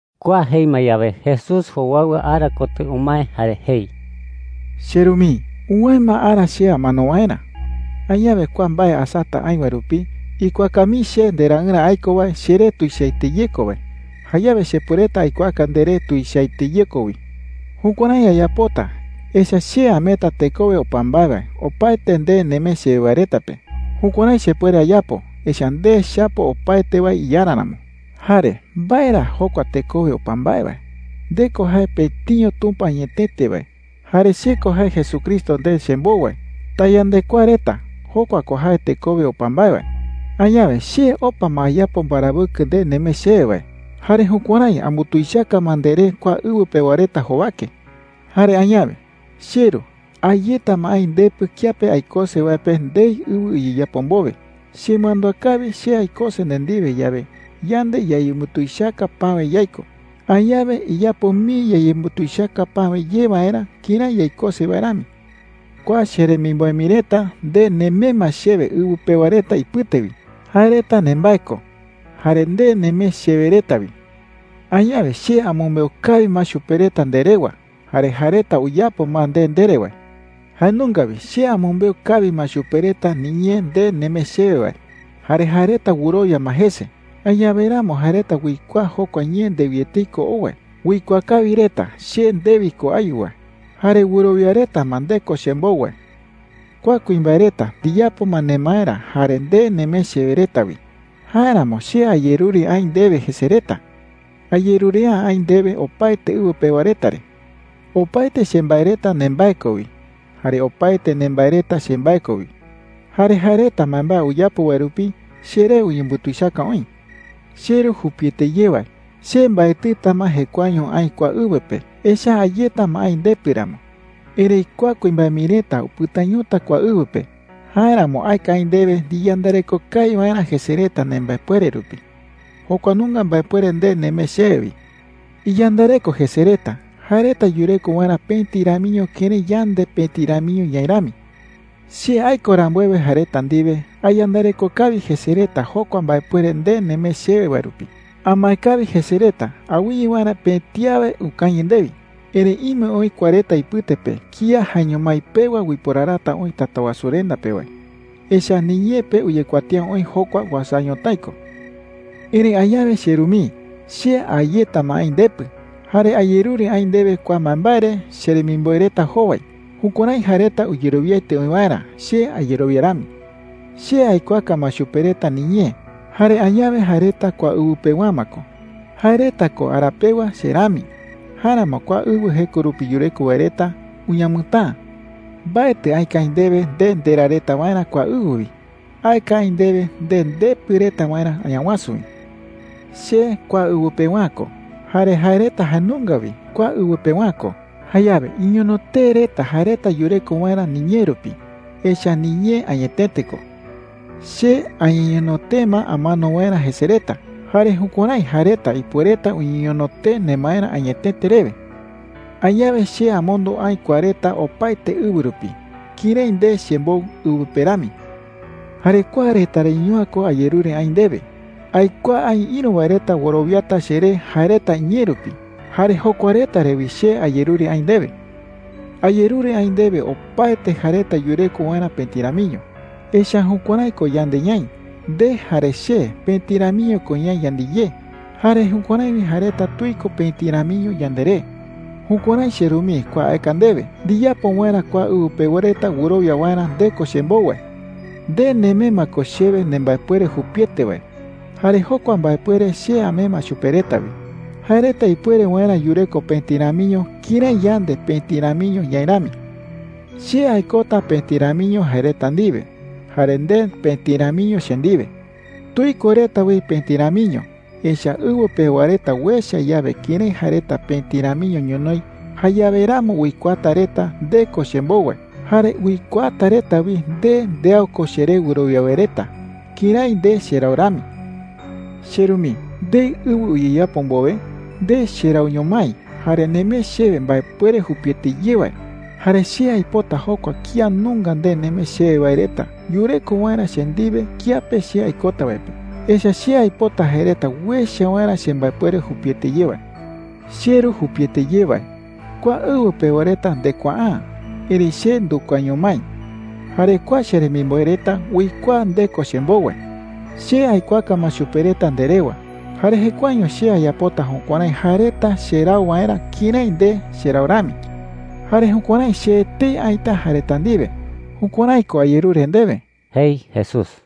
Kua jei ma yawe, Jesús jowaɨwa ara kotɨ umae jare jei: “CheRu mii, uwäe ma ara che amano waerä,” jei. “Añawe kua mbae asata aï wae rupi, ikuaaka mii che ndeRaɨrä aiko wae cheree tuichaete ye ko wae. Jayawe chepuereta aikuaaka nderee tuichaete ye ko wi,” jei. “Jukuärái ayapota, echa’ä che ameeta tekowe opa mbae wae opaete nde nemee chewe wae reta pe. Jukuärái chepuere ayapo, echa’ä nde chapo opaete wae iYarä ramo,” jei. “Jare ¿mbae ra jokua tekowe opa mbae? Nde ko jae pëtiño Tumpa añetete wae, jare che ko jae Jesucristo nde chembou wae. Tayandekuaa reta. Jokua ko jae tekowe opa mbae wae,” jei. “Añawe che opa ma ayapo mbarawɨkɨ nde nemee chewe wae. Jare jukuärái ambutuichaka ma nderee kua ɨwɨ pewa reta jowake,” jei. “Jare añawe, cheRu, a yeta ma aï ndepɨ kiape aikose wae pe ndei ɨwɨ uyeyapo mbowe. Chemandúa kawi, che aikose nde ndiwe yawe, yande yayembutuichaka päwe yaiko. Añawe iyapo mii yayembutuichaka päwe ye waerä kërái yaikose wae rami,” jei. “Kua cheremimboe mii reta, nde nemee ma chewe ɨwɨ pewa reta ipɨte wi. Jae reta nembae ko, jare nde nemee chewe reta wi,” jei. “Añawe che amɨmbeu kawi ma chupe reta nde rewa, jare jae reta uyapo ma nde ndere wae. Jae nunga wi che amɨmbeu kawi ma chupe reta niñee nde nemee chewe wae, jare jae reta wɨrowia ma jese. Añawe ramo jae reta uikuaa jokua ñee ndewi etei ko ou wae. Uikuaa kawi reta che ndewi ko ayu wae, jare wɨrowia reta ma nde ko chembou wae,” jei. “Kua kuimbae reta ndiyapo ma nemaerä jare nde nemee chewe reta wi. Jáeramo che ayerure aï ndewe jese reta. Ayerure’ä aï ndewe opaete ɨwɨ pewa reta re,” jei. “Opaete chembae reta nembae ko wi. Jare opaete nembae reta chembae ko wi. Jare jae reta mbaembae uyapo wae rupi cheree uyembutuichaka oï,” jei. “CheRu jupiete ye wae, che mbaetɨta ma jekuaeño aï kua ɨwɨ pe, echa’ä a yeta ma aï ndepɨ ramo. Erëi kua kuimbae mii reta upɨtañota kua ɨwɨ pe. Jáeramo aeka aï ndewe ndiyandareko kawi waerä jese reta nembaepuere rupi – jokua nunga mbaepuere nde nemee chewe wi,” jei. “Iyandareko jese reta, jae reta yureko waerä pëti ramiño kërái yande pëti ramiño ñaï rami,” jei. “Che aiko rambuewe jae reta ndiwe, ayandareko kawi jese reta jokua mbaepuere nde nemee chewe wae rupi. Amae kawi jese reta awɨye waerä pëti awe ukañɨ ndewi. Erëi ime oï kua reta ipɨte pe kía jaeño mái pewa uiporarata oï Tatawasurenda pe wae, echa’ä niñee pe uyekuatía oï jokua uasa ñotái ko,” jei. “Erëi añawe, cheRu mii, che a yeta ma aï ndepɨ. Jare ayerure aï ndewe kua mbaembae re cheremimboe reta jowai, jukuärái jae reta uyerowiaete oï waerä che ayerowia rami,” jei. “Che aikuaaka ma chupe reta niñee. Jare añawe jae reta kua ɨwɨ pewa’ä ma ko. Jae reta ko ara pewa che rami. Jáeramo kua ɨwɨ jeko rupi yureko wae reta uñamɨtäa,” jei. “Mbaetɨ aeka aï ndewe nde nderaa reta waerä kua ɨwɨ wi. Aeka aï ndewe nde ndepɨ reta waerä Añawasu wi,” jei. “Che kua ɨwɨ pewa’ä ko, jare jae reta jae nunga wi kua ɨwɨ pewa’ä ko. Jayawe iñono tee reta jae reta yureko waerä niñee rupi. Echa’ä niñee añetete ko,” jei. “Che añeñono tee ma amano waerä jese reta. Jare jukuärái jae reta ipuereta uñeñono tee nemaerä añetete rewe,” jei. “Añawe che amondo aï kua reta opaete ɨwɨ rupi kërái nde chembou ɨwɨ pe rami,” jei. “Jare kua reta reño’ä ko ayerure aï ndewe. Aikuaa aï ïru wae reta wɨrowiata cheré jae reta iñee rupi. Jare jokua reta re wi che ayerure aï ndewe,” jei. “Ayerure aï ndewe opaete jae reta yureko waerä pëti ramiño. Echa’ä jukuärái ko yande ñaï. Nde jare che pëti ramiño ko ñaï yandiyé. Jare jukuärái wi jae reta tuiko pëti ramiño yanderé. Jukuärái, cheRu mii, kua aeka ndewe ndiyapo waerä kua ɨwɨ pewa reta wɨrowia waerä nde ko chembou wae,” jei. “Nde nemee ma ko chewe nembaepuere jupiete wae. Jare jokua mbaepuere che amee ma chupe reta wi, jae reta ipuere waerä yureko pëti ramiño kërái yande pëti ramiño ñaï rami,” jei. “Che aikota pëti ramiño jae reta ndiwe, jare nde pëti ramiño che ndiwe. Tuiko reta wi pëti ramiño. Echa’ä ɨwɨ pewa reta uecha yawe kërái jae reta pëti ramiño ñonoï, jayawe ramo uikuaata reta nde ko chembou wae. Jare uikuaata reta wi nde ndeau ko cheré wɨrowia wae reta kërái nde cherau rami,” jei. “CheRu mii, ndei ɨwɨ uyeyapo mbowe, nde cherauño mái jare nemee chewe mbaepuere jupiete ye wae. Jare che aipota jokua kía nunga nde nemee chewe wae reta yureko waerä che ndiwe kiape che aikota wae pe. Echa’ä che aipota jae reta uecha waerä chembaepuere jupiete ye wae,” jei. “CheRu jupiete ye wae, kua ɨwɨ pewa reta ndekuaa’ä. Erëi che ndukuaaño mái. Jare kua cheremimboe reta uikuaa nde ko chembou wae,” jei. “Che aikuaaka ma chupe reta nde rewa, jare jekuaeño che ayapota jukuärái jae reta cherau waerä kërái nde cherau rami. Jare jukuärái che etei aïta jae reta ndiwe. Jukuärái ko ayerure ndewe,” jei Jesús.